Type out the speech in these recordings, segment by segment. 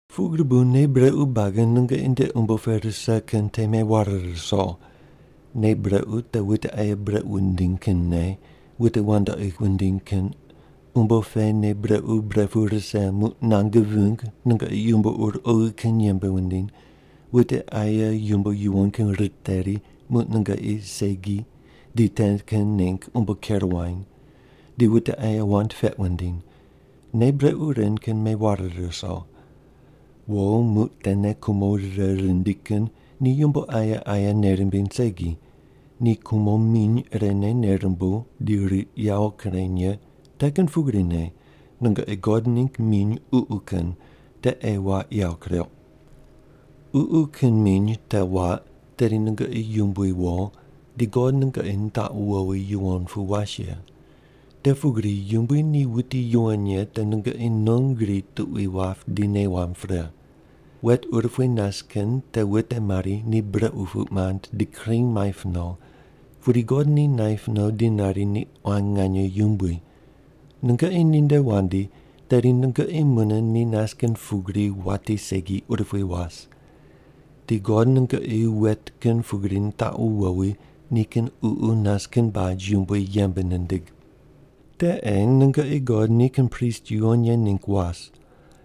Pugri bu nei brequ buagi nungoqi nde umbo pe rise kin te meware ruso. Nei brequ te wute aye brequ wundiny kin nei, wute wandoqi wundiny kin, umbo pe nei brequ bre pu rise muq nange ving nungoqi yumbo ur oghi kin yembe wundiny, wute aye yumbo yuwon kin riteri muq nungoqi segi di te kin ningg umbo ker wuany, di wute aye wand peq wundiny. Nei brequ ren kin meware ruso. Wo muq tene kumo rire rindi kin ni yumbo aye aye nei rimbiny segi, ni kumo miny irene nei rumbuw di riq yawo kureny ye te kin pugrine nungoqi God ningg miny ququ kin te ei waq yawo kureuq. Ququ kin miny te waq, tedi nungoqi yumbui wo, di God nungoqi nitaqu wowi yuwon pu was ye. Te pugri Yumbui ni wuti yuwon ye te nungoqi non gri tuqui wap di nei wamb pre. Wet urupui nas kin te wute mari ni brequ puq mand di kring maip no, pudi God ni naip no di nari ni quan nganye yumbui. Nungoqi ninde wandi, tedi nungoqi mune ni nas kin pugri wati segi urupui was. Di God nungoqi wet kin pugri nitaqu wowi nikin Ququ nas kin baj yumbui yembe nindig. Te ei nungoqi God nikin prist yuwon ye ningg was.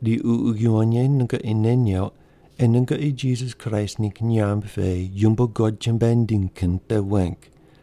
Di Ququ Yuwon Ye nungoqi nei neuq ei nungoqi Jisas Kraist ningg nyamb pe yumbo God chumbuai nindiny kin te weng.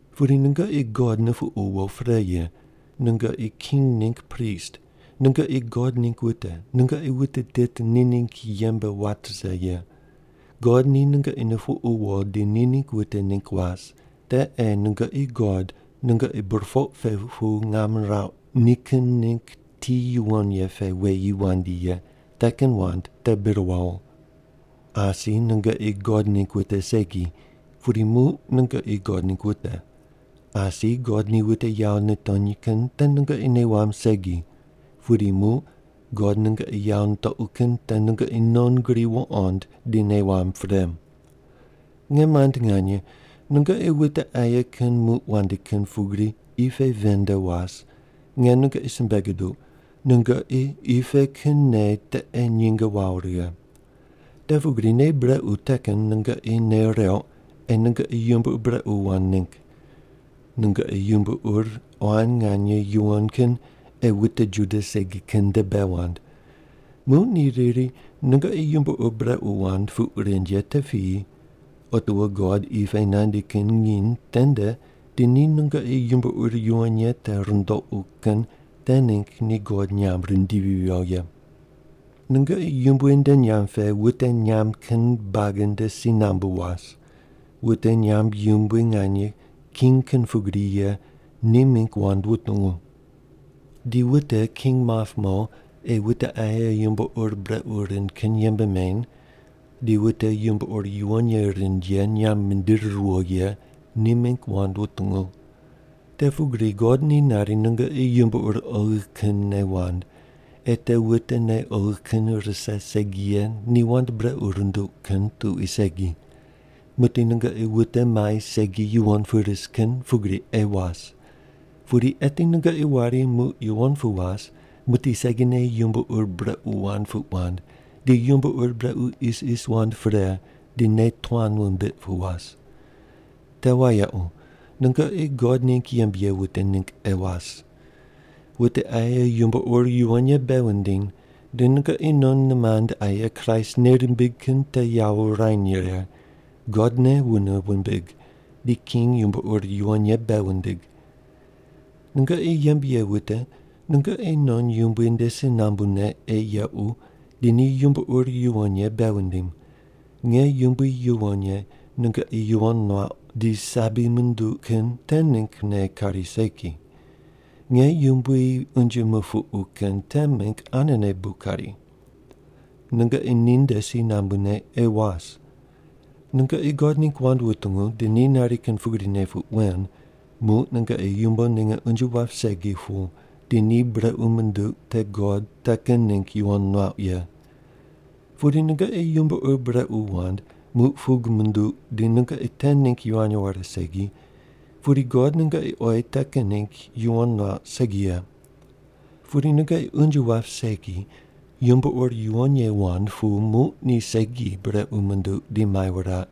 Pudi nungoqi God nupuqu wo pre ye, nungoqi king ningg prist, nungoqi God ningg wute, nungoqi wute tit ni ningg yembe wat rise ye. God ni nungoqi nupuqu wo di ni ningg wute ningg was, te ei nungoqi God nungoqi burpoq pe pu ngam nirauq nikin ningg ti yuwon ye pe weyi wandi ye te kin wand te bir wawo. Asi nungoqi God ningg wute segi, pudi muq nungoqi God ningg wute. Asi God ni wute yawo nitony kin te nungoqi nei wamb segi. Pudi muq God nungoqi yawo nitoqu kin te nungoqi non gri wuqond di nei wamb pre. Nge mand nganye, nungoqi wute aye kin muq wandi kin pugri qi pe ven nde was, nge nungoqi simbe guduq, nungoqi qi pe kin nei te ei nyinge wawo righe. Te pugri nei brequ te kin nungoqi nei reuq ei nungoqi yumbo ur brequ wand ningg. Nungoqi yumbo ur quan nganye yuwon kin ei wute Juda segi kin nde bei wand. Muq ni riri, “Nungoqi yumbo ur brequ wand” puq rind ye te piyi, otiwo God qi pe nandi kin nginy tende di ni nungoqi yumbo ur yuwon ye te rundoqu kin te ningg ni God nyamb rindivi viyo ye. Nungoqi Yumbui nde nyamb pe wute nyamb kin buagi nde si nambu was. Wute nyamb yumbui nganye, king kin pugri ye, ni mingg wand wutungu. Di wute king map mo ei wute aye yumbo ur brequ rind kin yembe meny di wute yumbo ur yuwon ye rind ye nyamb mindiri riyo ye ni mingg wand wutungu. Te pugri God ni nari nungoqi yumbo ur oghi kinne wand, ei te wute nei oghi kin rise segi ye ni wand brequ runduq kin tuqui segi. Muqdi nungoqi wute mai segi yuwon pu ris kin pugri ei was. Pudi eti nungoqi wari muq yuwon pu was muqdi segine yumbo ur brequ wand puq wand di yumbo ur brequ isis wand pre di nei tuan wumbiq pu was. Te wayequ, nungoqi God ningg yembe ye wute ningg ei was. Wute aye yumbo ur yuwon ye bei wundiny, di nungoqi non nimand aye Kraist nei rimbig kin te yawo wurany righe, God ne wune wumbig, di king yumbo ur yuwon ye bei wundig. Nungoqi yembe ye wute nungoqi non yumbui nde si nambune ei yequ di ni yumbo ur yuwon ye bei wundim. Nge yumbui yuwon ye nungoqi yuwon muauq di sabi munduq kin te minggne kari segi, nge yumbui unje mupuqu kin te mingg anene bu kari. Nungoqi ninde si nambune ei was. Nungoqi God ningg wand wutungu di ni nari kin pugrine puq wen, muq nungoqi yumbo ninge unje wap segi pu di ni brequ munduq te God te kin ningg yuwon nuauq ye. Pudi nungoqi yumbo ur brequ wand muq pug munduq di nungoqi te ningg yivany ware segi, pudi God nungoqi oyi te kin ningg yuwon nuauq segi ye. Pudi nungoqi unje wap segi yumbo ur yuwon ye wand pu muq ni segi brequ munduq di mai wuraq,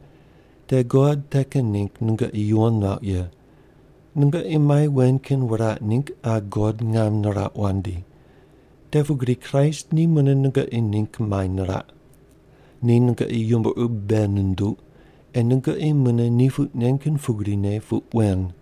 te God te kin ningg nungoqi yuwon nuauq ye. Nungoqi mai wen kin wuraq ningg qa God ngam nirauq wandi. Te pugri Kraist ni mune nungoqi ningg mai niraq. Ni nungoqi yumbo ur bei nunduq ei nungoqi mune ni puq nen kin pugrine puq wen.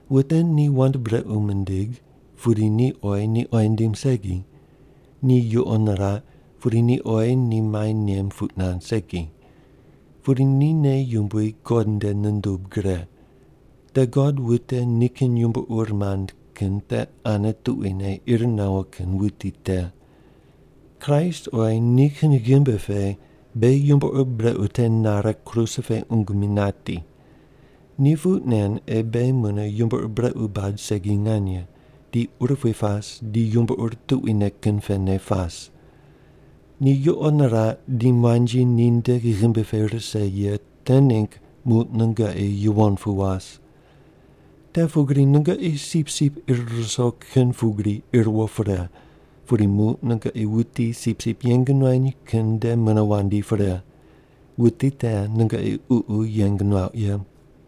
Wute ni wand brequ mindig, pudi ni oyi ni oyi nindim segi. Ni yuqo niraq, pudi ni oyi ni mai nem puq nand segi. Pudi ni nei yumbui God nde nundub gre. Te God wute nikin yumbo ur mand kin te ane tuquine ir nawo kin wuti te. Kraist oyi nikin ghimbi pe beghi yumbo ur brequ te nare kruse pe qungu mi nati. Ni puq nen ei beghi mune yumbo ur brequ bad segi nganye, di urupui pas di yumbo ur tuquine kin pene pas. Ni yuqo niraq di muanji ninde ghimbi pe rise ye te ningg muq nungoqi yuwon pu was. Te pugri nungoqi sipsip ir ruso kin pugri ir wo pre, pudi muq nungoqi wuti sipsip yeng nuany kin nde mune wandi pre. Wuti te nungoqi ququ yeng nuauq ye.